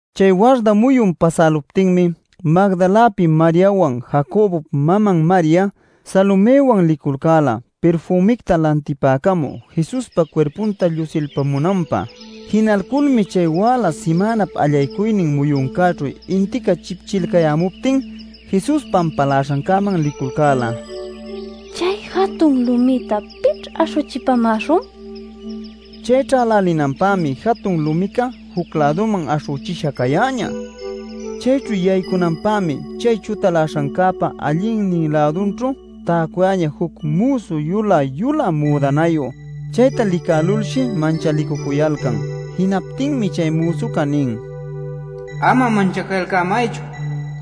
Chay warda muyun pasäluptinmi Magdalapi Mariawan, Jacobop maman Maria, Salomëwan liculcäla pirfümicta lantipacamü Jesuspa cuirpunta llusilpamunanpä. Jinalculmi chay wäla simänap allaycuynin muyuncäćhu intica chipchilcayämuptin Jesus pampaläśhancäman liculcäla “¿Chay jatun lumïta pićh aśhüchipamäśhun?” ninacuśhtin. Chay ćhälälinanpämi jatun lumica juc-läduman aśhüchisha cayäñä. Chayćhu yaycunanpämi chay chutaläśhancäpa allïnin-lädućhu täcuyäñä juc müsu yulä-yulä müdanayu. Chayta licälulshi manchalicucuyalcan. Jinaptinmi chay müsuca nin: “Ama manchacalcämaychu.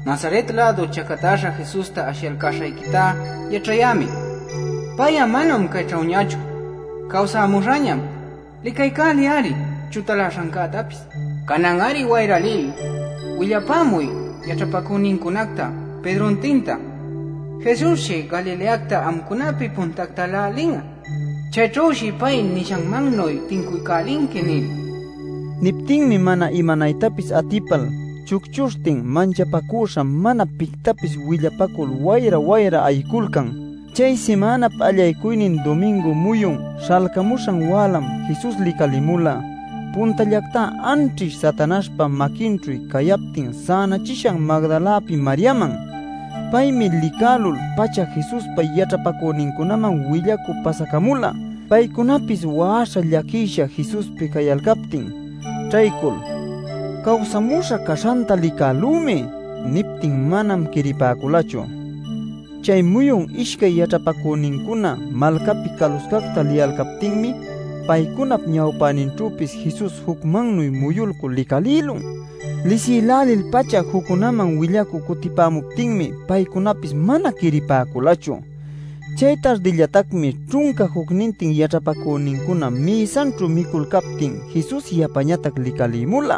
Nazaret-lädu chacatäśha Jesusta ashiyalcäśhayquita yaćhayämi. Pay'a manam cayćhüñachu, cawsämuśhañam. Licaycäliy-ari chutaläśhancätapis. Canan-ari wayra lil willapämuy yaćhapacünincunacta Pedrontinta: ‘Jesusshi Galileacta amcunapi puntactalä lin'a. Chayćhüshi pay nishanmannuy tincuycälinqui’ nil” nila. Niptinmi mana imanaytapis atipal chucchuśhtin manchapacüśha mana pictapis willapacul wayra-wayra ayiculcan. ˻ Chay simänap allaycuynin dumingu muyun śhalcamuśhan wälam Jesus licalimula puntallactá anćhish Satanaśhpa maquinćhu cayaptin sänachishan Magdalapi Mariaman. Paymi licälul-pacha Jesuspa yaćhapacünincunaman willacü pasacamula, paycunapis wa'aśha llaquisha Jesuspi cayalcaptin. Ćhaycul “¡Cawsämuśha caśhanta licälümi!” niptin manam quiripäculachu. Chay muyun ishcay yaćhapacünincuna malcapi caluscacta liyalcaptinmi paycunap ñawpäninćhüpis Jesus jucmannuy muyulcul licalïlun. Lisïlälil-pacha juccunäman willaycü cutipämuptinmi paycunapis mana quiripäculachu. Chay tardillatacmi ćhunca jucnintin yaćhapacünincuna mïsanćhu miculcaptin Jesus yapañatac licalïmula.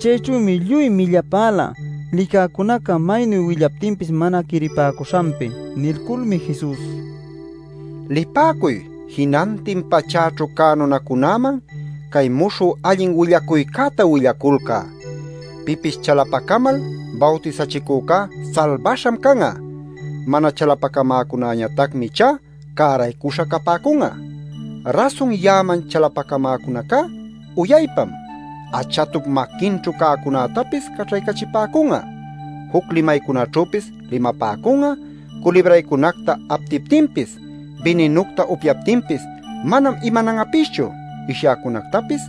Chayćhümi lluy millapäla, licäcunaca maynu willaptinpis mana quiripäcuśhanpi. Nilculmi Jesus: “Lipäcuy jinantin pachäćhu cä nunacunäman cay muśhü allin willacuycäta willaculcä. Pipis chalapacamal bawtisachicücá salbaśham can'a. Mana chalapacamäcunäñatacmi ichá cäraycüśha capäcun'a. Rasun ya'aman chalapacamäcunacá uyaypam: achatup maquinćhu cäcunätapis caćhaycachipäcun'a, juc limaycunaćhüpis limapäcun'a, culibraycunacta aptiptinpis, bininucta upyaptinpis manam imanan'apischu, ishyäcunactapis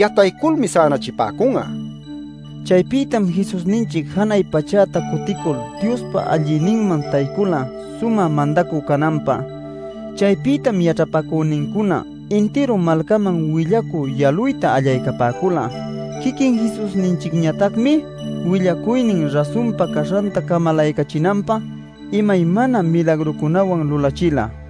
yatayculmi sänachipäcun'a” nila. Chaypïtam Jesusninchic janay pachäta cuticul Diospa allïninman taycula sumä mandacü cananpä. Chaypïtam yaćhapacünincuna intiru malcaman willacü yaluyta allaycapäcula. Quiquin Jesusninchicñatacmi willacuynin rasunpa caśhanta camalaycachinanpä imaymana milagrucunawan lulachila.˼